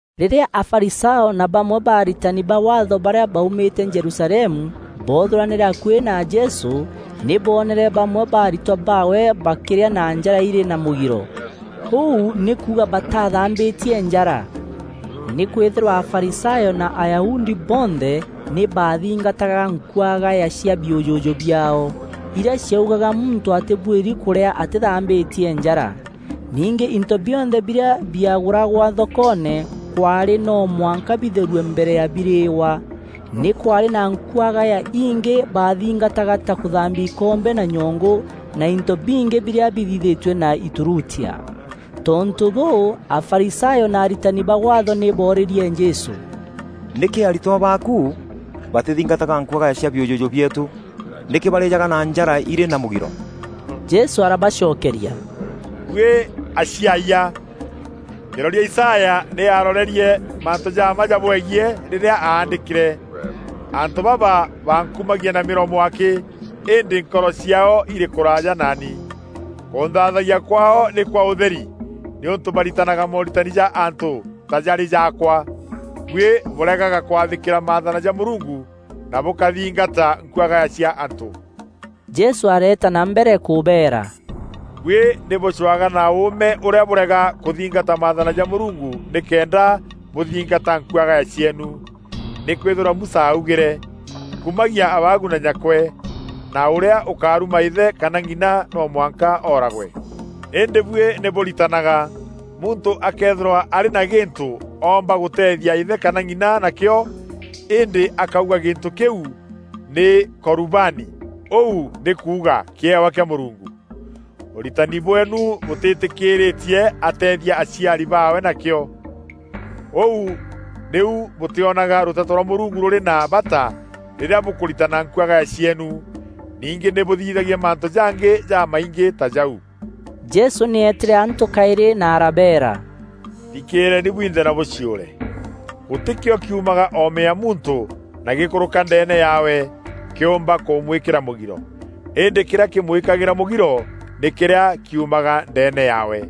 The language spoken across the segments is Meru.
Rîrîa Afarisayo na bamwe ba aritani ba Waatho barîa baumîte Jerusalemu, boothûranîre akuî na Jesû, nî boonere bamwe ba aritwa baawe bakîrîa na njara îrî na mûgiro, ûu nî kuuga bataathambîtie njara. (Nîkwîthîrwa Afarisayo na Ayahudi bonthe, nî baathingataga nkuagaya cia biûjûjû biaao, irîa ciaugaga muntû atîbuîri kûrîa atîthambîtie njara. Ningî into bionthe birîa biagûragwa thokoone, kwaarî no mwanka bitherue mbere ya birîîwa. Nî kwaarî na nkuagaya ingî baathingataga ta kûthambia ikombe na nyongû na into bingî birîa bithithîtue na îturutia.) Tontû bûû, Afarisayo na aritani ba Waatho nî boorîrie Jesû, “Nîkî aritwa baaku batîthingataga nkuagaya cia biûjûjû bieetû? Nîkî barîjaga na njara irî na mûgiro?” Jesû arabacokeria, “Buî aciaayia! Kîroria Isaya nî aarorerie mantû ja mma jabwegiî rîrîa aandîkîre: ‘Antû baba bankumagia na mîromo akî, îndî nkoro ciaao irî kûraaja naani. Kûnthaathayia kwaao nî kwa ûtheri, nîûntû baritanaga mooritani ja antû ta jarî jaakwa.’ “Buî bûregaga kwathîkîra maathana ja Mûrungu na bûkathingata nkuagaya cia antû.” Jesû areeta na mbere kûbeera, “Buî nî bûcwaga na ûûme ûrîa bûrega kûthingata maathana ja Mûrungu nîkenda bûthingata nkuagaya cieenu. Nîkwîthîrwa Musa augîre, ‘Kumagia abaagu na nyakwe,’ na ‘Ûrîa ûkaruma îthe kana ng'ina no mwanka ooragwe.’ Îndî buî nî bûritanaga, ‘Muntû akëethîrwa arî na gîntû oomba gûteethia îthe kana ng’ina nakîo, îndî akauga gîntû kîu nî ‘Korubani’ (ûu nî kuuga ‘kîewa kîa Mûrungu’), ûritani bweenu bûtîtîkîîrîtie ateethia aciari baawe nakîo. Ûu nîu bûtîonaga rûteto rwa Mûrungu rûrî na bata rîrîa bûkûritana nkuagaya cieenu. Ningî nî bûthithagia mantû jangî jamaingî ta jau.” Jesû nî eetîre antû kaîrî na arabeera, “Thikîîreeni bwinthe na bûciûre. Gûtî kîo kîumaga oome ya muntû na gîkûrûka ndeene yaawe, kîûmba kûmwîkîra mûgiro. Îndî kîrîa kîmwîkagîra mûgiro nî kîrîa kiumaga ndeene yaawe. [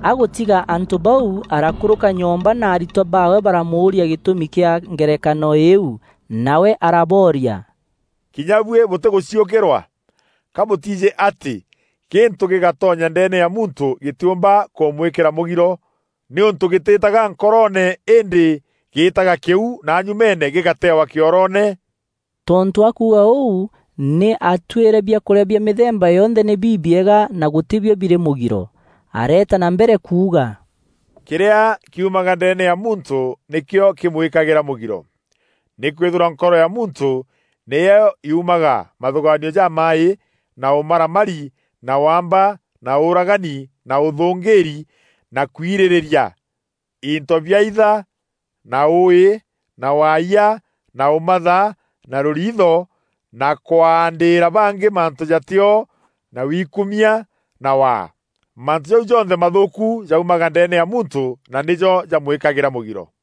Agûtiga antû bau arakûrûka nyomba na aritwa baawe baramûûria gîtûmi kîa ngerekano îîu. Nawe arabooria, “Kinya buî bûtîgûciûkîrwa? Ka bûtiijî atî gîntû gîgatonya ndeene ya muntû gîtîûmba kûmûîkîra mûgiro, nîûntû gîtîîtaga nkoroone îndî gîîtaga kîu na nyumeene gîgatewa kîoroone? (Tontû akuuga ûu, nî aatuîre biakûrîa bia mîthemba yonthe nî bibiega na gûtî bio birî mûgiro.)” Areeta na mbere kuuga, “Kîrîa kiumaga ndeene ya muntû nîkîo kîmwîkagîra mûgiro. Nîkwîthîrwa nkoro ya muntû nîyo yuumaga mathûgaanio jamaaî na ûmaramari na waamba na ûûragani na ûthûngîîri na kwirîrîria into biaitha na ûûî na waayia na ûmatha na rûriitho na kwaandîîra bangî mantû jatîo na wikumia na waa. Mantû jau jonthe mathûûku jaumaga ndeene ya muntû na nîjo jamwîkagîra mûgiro.”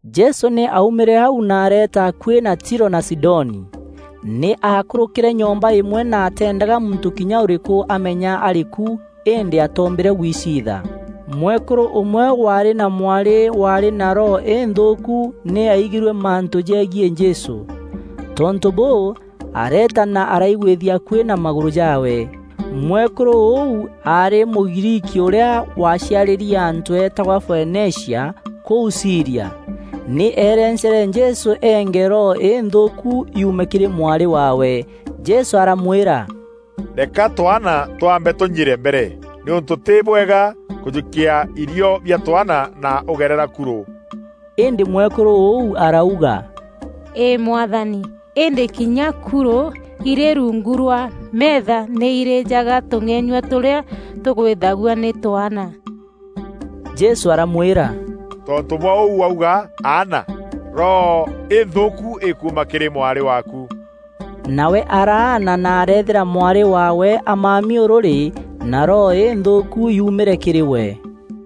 Jesû nî aaumîre au na areeta akuî na Tiro na Sidoni. Nî aakûrûkîre nyomba îmwe na ateendaga muntû kînya ûrîkû amenya arî ku îndî atoombîre gwiciitha. Mwekûrû ûmwe waarî na mwarî waarî na roho înthûûku nî aigîrue mantû jegiî Jesû. Tontû bûû, areeta na araigwîthia akuî na magûrû jaawe. Mwekûrû ûu aarî Mûgriiki ûrîa waaciarîri antû eetagwa Foenicia, kûu Sîria. Nî eerencere Jesû eenge roho înthûûku yuume kîrî mwarî waawe. Jesû aramwîra, “Reka twaana twambe tûnyire mbere nîûntû tî bwega kûjûkia irio bia twaana na ûgerera kurû.” Îndî mwekûrû ûu arauga, “Îî Mwathani, îndî kinya kurû irî rungu rwa meetha, nî irîjaga tûng'enyua tûrîa tûgwîthagua nî twaana.” Jesû aramwîra, “Tontû bwa ûu wauga, aana. Roho înthûûku îkuuma kîrî mwarî waaku!” Nawe araana na areethîra mwarî waawe amami ûrûrî na roho înthûûku yuumîre kîrî we.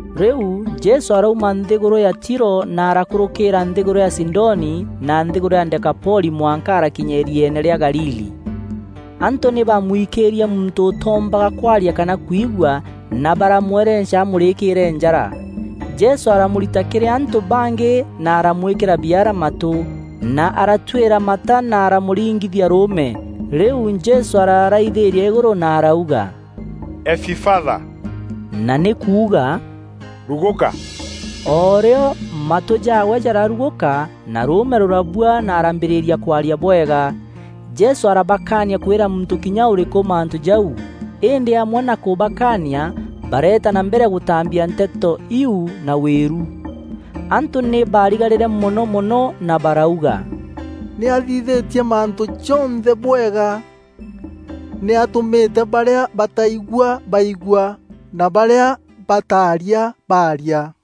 Rîu Jesû arauma nthîgûrû ya Tiro na arakûrûkîîra nthîgûrû ya Sidoni na nthîgûrû ya Dekapoli mwanka arakinya îrieene rîa Galili. Antû nî baamwikîîrie muntû ûtoombaga kwaria kana kwigua na baramwerenca amûrîkîîre njara. Jesû aramûrita kîrî antû bangî na aramwîkîra biara matû, na aratuîra mata na aramûringithia rûûme. Rîu Jesû araraithîîria îgûrû na arauga, “Efifatha,” na nî kuuga, “Rugûka.” O rîo, matû jaawe jararugûka, na rûûme rûrabua na araambîrîria kwaria bwega. Jesû arabakaania kwîra muntû kinya ûrîkû mantû jau, îndî amwe na kûbakania bareeta na mbere gûtaambia nteto iu na wîru. Antû nî baarigarîre mono mono na barauga, “Nî aathithîtie mantû jonthe bwega. Nî aatûmîte barîa bataigua baigua na barîa bataaria baaria!”